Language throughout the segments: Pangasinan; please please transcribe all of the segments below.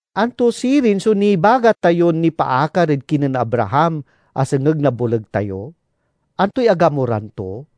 Anto sirin so nibaga tayon nipaakar ed kinen Abraham a sengeg na boleg tayo? Antoy agamuran to?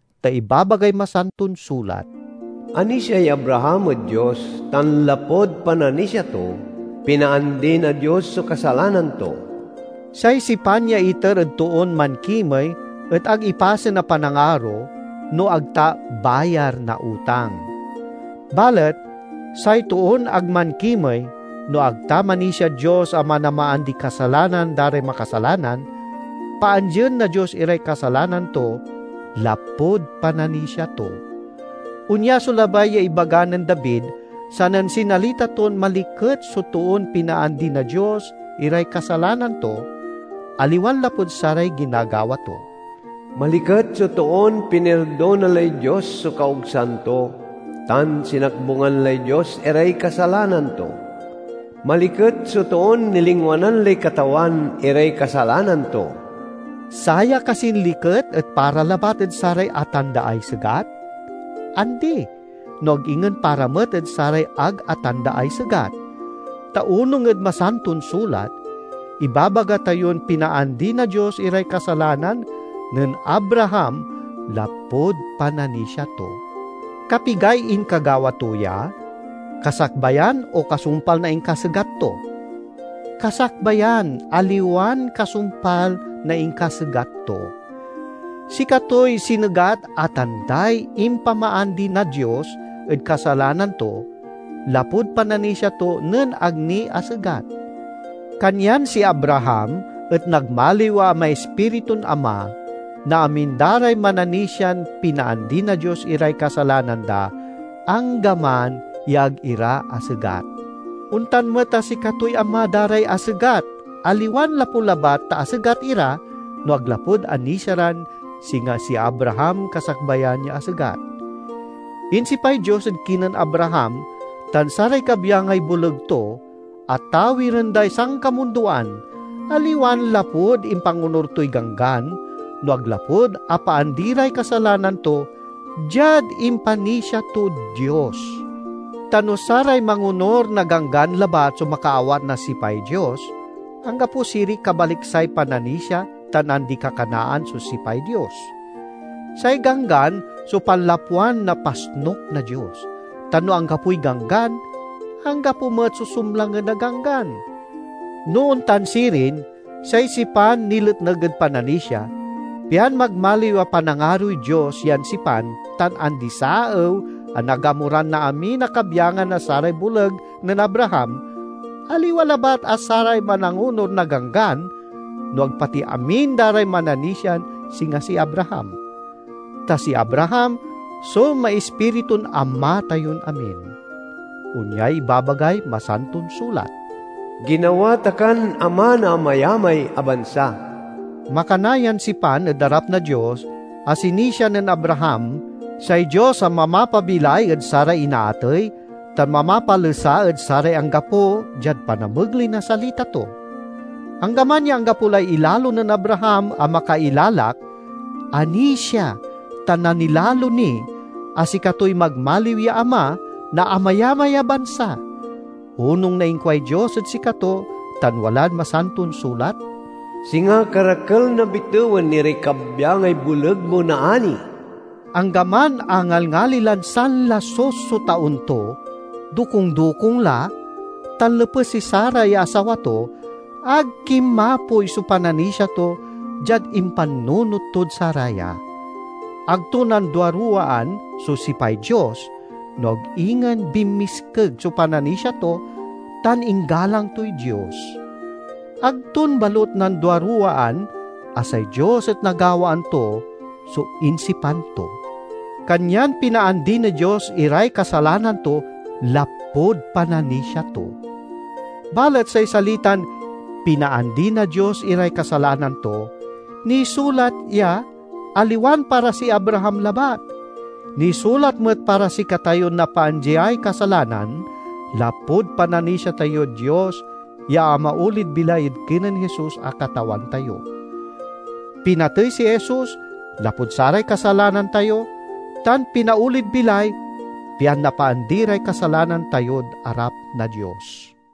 ta ibabagay Masanton Sulat, "Anisiay Abraham ed Dios tan lapud pananisia to, pinaandi na Dios so kasalanan to." Say sipan ya iter ed toon mankimey et ag ipasen a panangaro no ag ta bayar na utang. Balet say toon ag mankimey, no ag ta manisiad Dios a manamaandiy kasalanan da ray makasalanan, paandien na Dios iray kasalanan to lapud pananisia to. Onya so labay ya ibaga nen David sanen sinalita ton maliket so toon pinaandi na Dios iray kasalanan to, aliwan lapud saray ginagawa to: "Maliket so toon pinirdona lay Dios so kaogsan to, tan sinakbungan lay Dios iray kasalanan to! Maliket so toon nilingwanan lay Katawan iray kasalanan to!" Saya kasin liket et para labat ed saray atandaay segat? Andi, no ag ingen para met ed saray ag atandaay segat. Ta onung ed Masanton Sulat, ibabaga tayon pinaandi na Dios iray kasalanan nen Abraham lapud pananisia to. Kapigay inkagawa to ya? Kasakbayan o kasumpal na inkasegat to? Kasakbayan, aliwan kasumpal, na inkasegat to. Sikatoy sinegat a tanday impamaandi na Dios ed kasalanan to lapud pananisia to nen ag ni asegat. Kanyan si Abraham et nagmaliw a maispiritun ama na amin da ray mananisian pinaandi na Dios iray kasalanan da, anggaman ya ag ira asegat. Ontan met a sikatoy ama da ray asegat, aliwan lapu labat ta asegat ira, no ag lapud anisia ran singa si Abraham kasakbayan ya asegat. Insipay Dios ed kinen Abraham tan saray kabyangay boleg to a tawiren day sankamundoan, aliwan lapud impangonur toy Ganggan, no ag lapud apaandi ray kasalanan to diad impanisia tod Dios. Ta no saray mangonur na Ganggan labat so makaawat na sipay Dios, anggapo siriy kabaliksay pananisia tan andi-kakanaan so sipay Dios. Say Ganggan so panlapwan na pasnuk na Dios; ta no anggapoy ganggan, anggapo met so sumlangen a ganggan. No ontan sirin, say sipan niletneg ed pananisia, pian magmaliw a panangaroy Dios yan sipan tan andi-saew a nagamuran na amin a kabyangan na saray boleg nen Abraham aliwa labat a saray manangonur na Ganggan, no ag pati amin da ray mananisian singa si Abraham. Ta si Abraham so maispiritun ama tayon amin. Onyay ibabagay Masanton Sulat: "Ginawa ta kan ama na amayamay a bansa." Makana yan sipan ed arap na Dios a sinisia nen Abraham, say Dios a mamapabilay ed saray inaatey, tan mamapalesa ed saray anggapo diad panamegley na salita to. Anggaman ya anggapo lay ilalo nen Abraham a makailalak, anisia tan nanilalo ni a sikatoy magmaliw ya ama na amayamay a bansa. Onung na inkuay Dios ed sikato tan walad Masanton Sulat, "Singa karakel na bitewen iray kabyangay boleg mo naani." Anggaman a ngalngali lan sanlasus so taon to, dokung-dokung la, tan lepes si Sara ya asawa to, ag kinmapoy so pananisia to diad impannunot tod saraya. Ag to nanduaruwaan so sipay Dios, no ag ingen binmiskeg so pananisia to tan inggalang toy Dios. Ag ton balut nanduaruwaan a say Dios et nagawaan to so insipan to. Kanyan pinaandi na Dios iray kasalanan to lapud pananisia to. Balet say salitan "pinaandi na Dios iray kasalanan to," nisulat ya aliwan para si Abraham labat. Nisulat met para sikatayon napaandiay kasalanan lapud pananisia tayod Dios ya amaolid bilay ed kinen Jesus a Katawan tayo. Pinatey si Jesus lapud saray kasalanan tayo, tan pinaolid bilay pian napaandi ray kasalanan tayod arap na Dios.